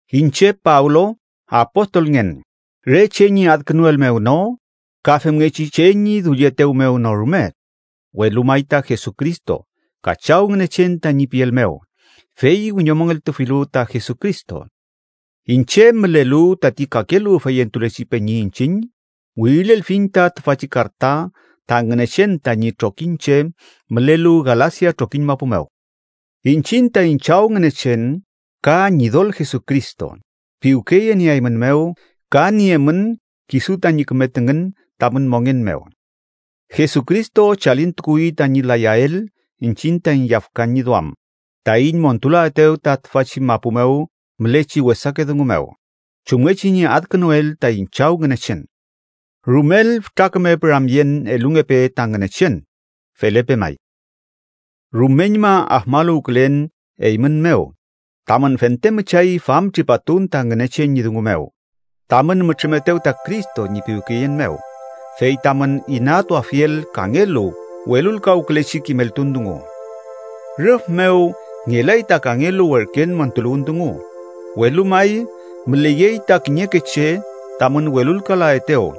Iñche, Pablo, apostolngen re che ñi adkünuel mew no ka femngechi che ñi dullietew mew no rume, welu may ta Jesucristo ka Chaw Ngünechen tañi piel mew, fey wiñomongeltufilu ta Jesucristo. Iñche mülelu tati kakelu feyentulechi peñi iñchiñ, wirilelfiñ ta tüfachi karta ta Ngünechen tañi trokiñche mülelu Galasia trokiñ mapu mew. Iñchiñ taiñ Chaw Ngünechen ka Ñidol Jesucristo piwkeyenieaeymünmew ka niemün kisu tañi küme tüngün tamün mongen mew. Jesucristo chalintukuwi tañi layael iñchiñ taiñ yafkan ñi duam, taiñ montulaetew ta tüfachi mapu mew mülechi wesake dungu mew, chumngechi ñi adkünuel taiñ Chaw Ngünechen. ¡Rumel fütra küme püramyen elungepe ta Ngünechen! Felepe may. Rumeñma afmaluwkülen eymün mew tamün fente müchay famtripatun ta Ngünechen ñi dungu mew, tamün mütrümetew ta Cristo ñi piwkeyen mew, fey tamün inatuafiel kangelu welulkawkülechi kimeltun dungu. Rüf mew ngelay ta kangelu werken montuluwün dungu, welu may müleyey ta kiñeke che tamün welulkalaetew,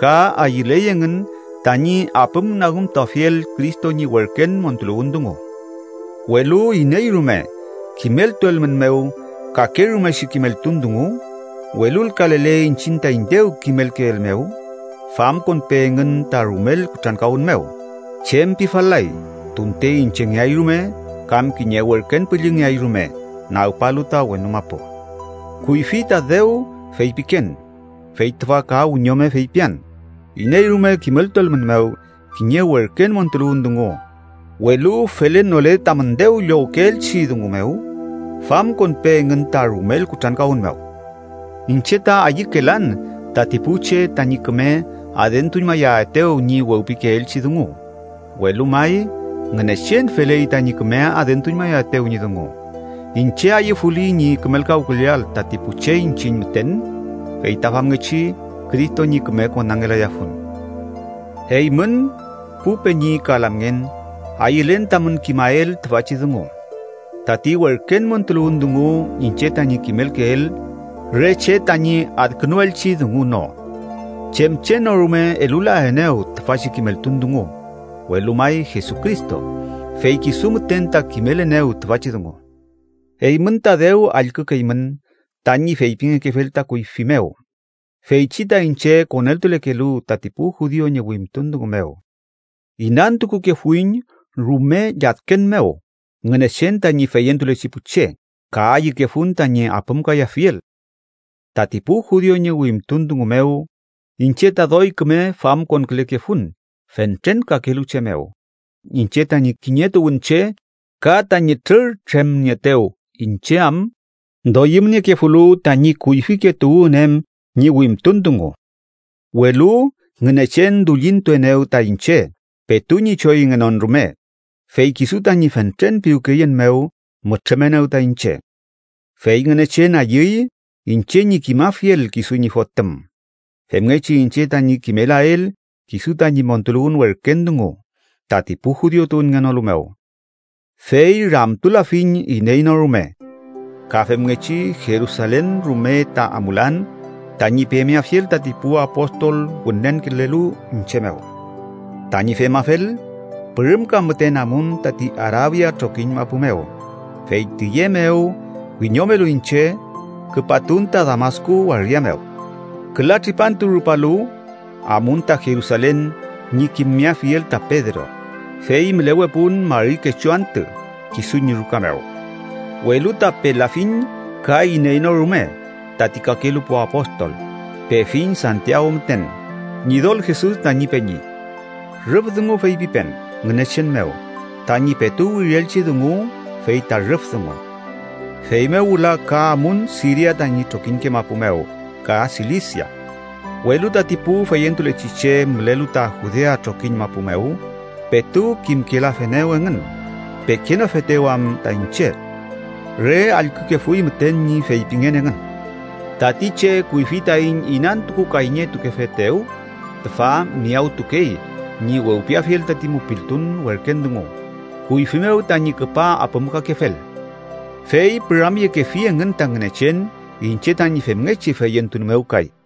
ka ayüley engün tañi apümnagümtuafiel Cristo ñi werken montuluwün dungu. Welu iney rume kimeltuelmünmew kakerumechi kimeltun dungu, welulkalele iñchiñ taiñ dew kimelkeel mew, famkonpe engün ta rumel kutrankawün mew, chem pifal-lay tunte iñchengeay rume kam kiñe werken püllüngeay rume nagpalu ta wenu mapu. Kuyfi ta dew feypiken, fey tüfa ka wiñome feypian: iney rume kimeltuelmünmew kiñe werken montuluwün dungu, welu felenole tamün dew llowkeelchi dungu mew, famkonpe engün ta rumel kutrankawün mew. Iñche ta ayükelan tati pu che tañi küme adentuñmayaetew ñi wewpikeelchi dungu, welu may Ngünechen feley tañi küme adentuñmayaetew ñi dungu. ¡Iñche ayüfuli ñi kümelkawküleael tati pu che iñchiñ müten, fey ta famngechi Cristo ñi küme konangelayafun! Eymün, pu peñi ka lamngen, ayülen tamün kimael tüfachi dungu: tati werken montuluwün dungu iñche tañi kimelkeel, re che tañi adkünuelchi dungu no. Chem che no rume elulaenew tüfachi kimeltun dungu, welu may Jesucristo, fey kisu müten ta kimelenew tüfachi dungu. Eymün ta dew allkükeymün tañi feypingekefel ta kuyfi mew, feychi ta iñche koneltulekelu tati pu judiu ñi wimtun dungu mew. Inantukukefuiñ rume lladken mew Ngünechen tañi feyentulechi pu che ka ayükefun tañi apümkayafiel. Tati pu judiu ñi wimtun dungu mew, iñche ta doy küme famkonkülekefun fentren kakelu che mew, iñche tañi kiñe tuwünche ka tañi trürtremnieetew, iñche am doyümniekefulu tañi kuyfike tuwün em ñi wimtun dungu. Welu Ngünechen dullintuenew ta iñche petu ñi choyüngenon rume, fey kisu tañi fentren piwkeyen mew mütrümenew ta iñche. Fey Ngünechen ayüy iñche ñi kimafiel kisu ñi Fotüm, femngechi iñche tañi kimelael kisu tañi montuluwün werken dungu tati pu judiu tuwünngenolu mew. Fey ramtulafiñ iney no rume. Ka femngechi Jerusalen rume ta amulan tañi pemeafiel tati pu apostol wünenkülelu iñche mew. Tañi femafel, pürümka müten amun tati Arabia trokiñ mapu mew, fey tiye mew wiñomelu iñche, küpatun ta Damasku waria mew. Küla tripantu rupalu, amun ta Jerusalen ñi kimmeafiel ta Pedro, fey mülewepun mari kechu antü kisu ñi ruka mew. Welu ta pelafiñ ka iney no rume tati kakelu pu apostol. Pefiñ Santiaw müten, Ñidol Jesus tañi peñi. Rüf dungu feypipen Ngünechen mew tañi petu wirielchi dungu fey ta rüf dungu. Feymew wüla ka amun Siria tañi trokiñke mapu mew ka Silisia. Welu tati pu feyentulechi che mülelu ta Judea trokiñ mapu mew petu kimkelafenew engün, pekenofetew am ta iñche. Re allkükefuy müten ñi feypingen engün: “Tati che kuyfi taiñ inantukukayñetukefetew, tüfa miyawtukey ñi wewpiafiel tati mupiltun werken dungu, kuyfi mew tañi küpa apümkakefel.” Fey püramyekefi engün ta Ngünechen iñche tañi femngechi feyentun mew kay.